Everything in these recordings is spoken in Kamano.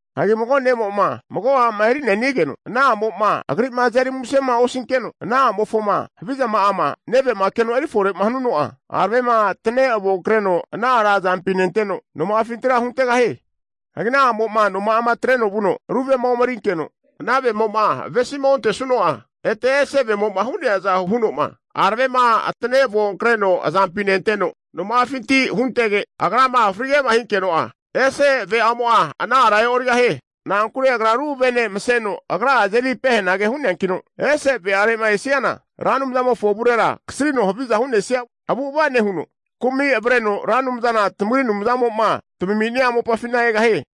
Hagi mago ne'mo'ma mago a'ma eri'ne'nigeno, ana a'mo'ma agri'ma azeri musema osinkeno, ana a'mofoma havizama'ama neve'ma keno erifore hanuno'a, aravema atane avonkreno ana ara azampi nenteno, noma'afintira huntegahie. Hagi ana a'mo'ma noma'a atreno vuno, ru vema omerinkeno, ana vemo'ma avesima ontesuno'a, ete ese ve'amo'ma hu'neaza huno'ma, aravema atane avonkreno azampi nenteno noma'afinti huntege, agrama frige'ma hinkeno'a, ese ve'amo'a ana ara e'origahie. Na'ankure agra ru vene maseno agra'a azeri pehenage hu'neankino, ese ve'are'ma esiana, Ra Anumzamofo avurera kasrino haviza hu'nesia avu'ava nehuno, kumi avreno Ra Anumzana tamagri Anumzamo'ma tamami'nia mopafina egahie.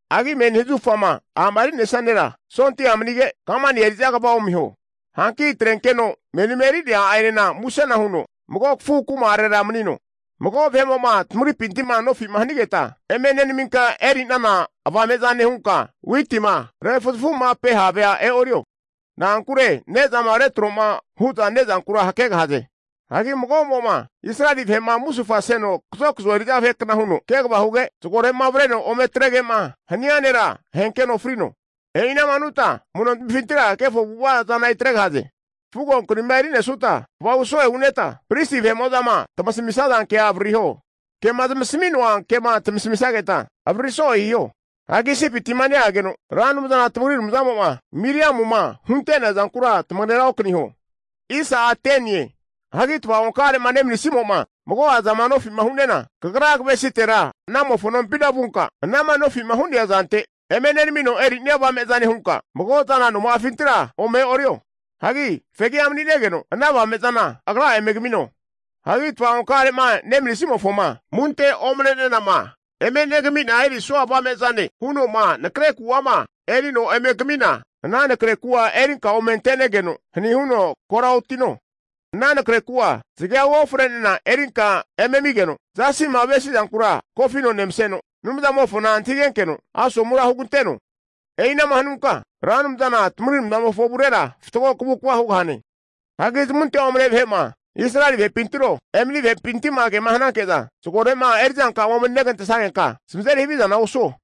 Hagi menima zahufama a'ma eri'nesia nera, sondia manige, kamani eri'za kva omiho. Hanki atrenkeno menima eri'nea a'enena musena huno mago kafu kuma'are manino. Mago vahe'mo'ma tamagripinti'ma nofi'ma nehanigetma, eme nenaminka eri'nana avame'zane hunka witima refuzafu'mape havea e'oriho. Na'akure ne'zama retro'ma hu'za ne'zankura hakegahaze. Hagi mago'mo'ma Israeli vahe'ma musufaseno kazokazo eri'za vahekna huno kegava huge, zagore'ma avreno ome atrege'ma hania nera, ahenkeno frino. E'ina'ma hanutma amu'notmifintira kefo avu'ava zana eri atregahaze. Fugo krima erisutma kvahu so'e huneta, Pristi vahe'mo'zama tamasamisaza kea avaririho. Kema zamasami'noa kema tamasamisageta avaririso'e hiho. Hagi Isipiti'ma neageno Ra Anumzana tamagri Anumzamo'ma Miriamuma hunte'nea zankura, tamagera okaniho. Hagi tava'onka'are'ma nemanisimo'ma mago'a zama nofi'ma hu'nena, kagra kavesitera anamofo nompina vunka anama nofi'ma hu'nea zante eme nenamino eri'nia avame zane hunka mago zana noma'afintira ome e'orio. Hagi fegi'a mani'negeno, ana avame'zana agra'a eme kamino. Hagi tava'onka'are'ma nemanisimofoma amunte omne'nenama eme negami'na erisua avame'zane huno'ma nakre ku'ama erino eme kamina, ana nakre kura erinka ome ante'negeno hani huno kora otino. Ana nakre ku'a zagea uofre'nena erinka eme amigeno, zasi'ma avesi'zankura kofino nemaseno, Anumzamofona antahigenkeno asomura huganteno. E'ina'ma hanunka Ra Anumzana tamagri Anumzamofo avurera fatgo kavukva hugahane. Hagi zamunte omne vahe'ma Israeli vahepintiro, emani vahepinti'ma kema hananke'za zagore'ma eri'zanka'ama emeri negantesagenka, zamazeri havizana osuo.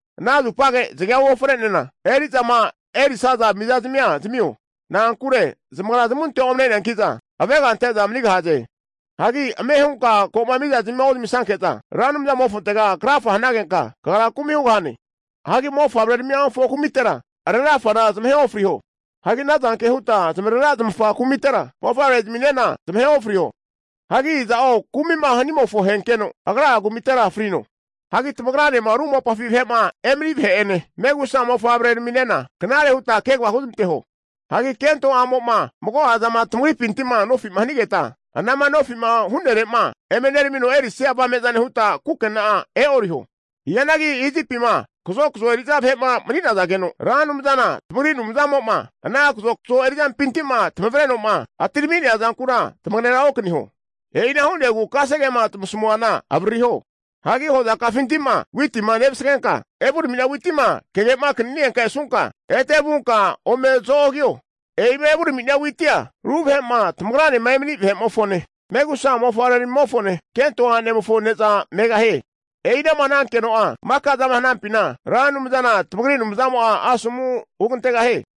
Ana zupage zagea uofre'nena eri'zama erisaza mizazamia zamio. Na'ankure zamagra zamunte omne'neanki'za avega ante'za manigahaze. Hagi ame hunka ko'ma mizazmima ozamisanke'za, Ra Anumzamofontega krafa hanagenka, kagra kumi hugahane. Hagi mofavre'aramimofo kumitera arera afana zamahe ofriho. Hagi ana zanke hutma zamarera zamafa kumitera mofavreramina zamahe ofriho. Hagi iza'o kumi'ma hanimofo ahenkeno, agra'a kumitera frino. Hagi tamagranema ru mopafi vahe'ma emani vahe'ene, megusa mofavrenena knare hutma kegava huzmanteho. Hagi kento a'mo'ma mago'a zama tamagripinti'ma nofi'ma hanigetma, anama nofi'ma hu'nere'ma eme neramino erisia avame'zane hutma kukena'a e'oriho. Hianagi Isipima kazokazo eri'za vahe'ma mani'nazageno, Ra Anumzana tamagri Anumzamo'ma ana kazokazo eri'zampinti'ma tamavreno'ma atirami'nea zankura tamagera okaniho. E'ina hu'negu kasegema tamasamuana avaririho. Hagi hozatamifinti'ma witima nevasagesutma evurami'nia witima tamagemakanita esunka, ete vuta ome zo'ogiho. E'ima evurami'nia witia, ru vahe'ma tamagranema emani vahe'mofone, megusa mofavreramimofone, kento a'nemofo ne'za megahie. E'inama hanageno'a maka zama hanafina, Ra Anumzana tamagri Anumzamo'a asomu huramantegahie.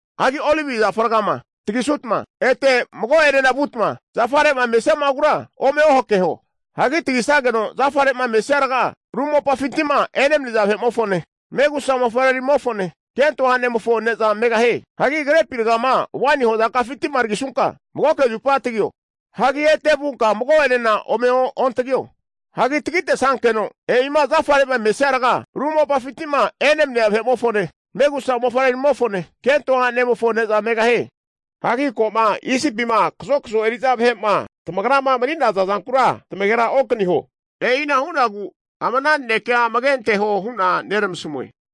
Hagi olive zafa ragama tagisutma, ete mago'enena vutma zafare'ma mesiama'agura ome ohakeho. Hagi tagisageno zafare'ma mesia raga, ru mopafinti'ma enemania vahe'mofone, megusa mofavreramimofone, kento a'nemofo ne'za megahie. Hagi krepi ragama waini hozaka'afinti'ma tagisunka, magoke zupa tagio. Hagi ete vunka mago'enena ome ontagio. Hagi tagitesankeno e'ima zafare'ma mesia raga, ru mopafinti'ma enemania vahe'mofone, megusa mofavreramimofone, kento a'nemofo ne'za megahie. Hagi ko'ma Isipima kazokazo eri'za vahe'ma tamagrama mani'naza zankura tamagera okaniho. E'ina hu'nagu ama ana nanekea amage anteho hu'na neramasmue.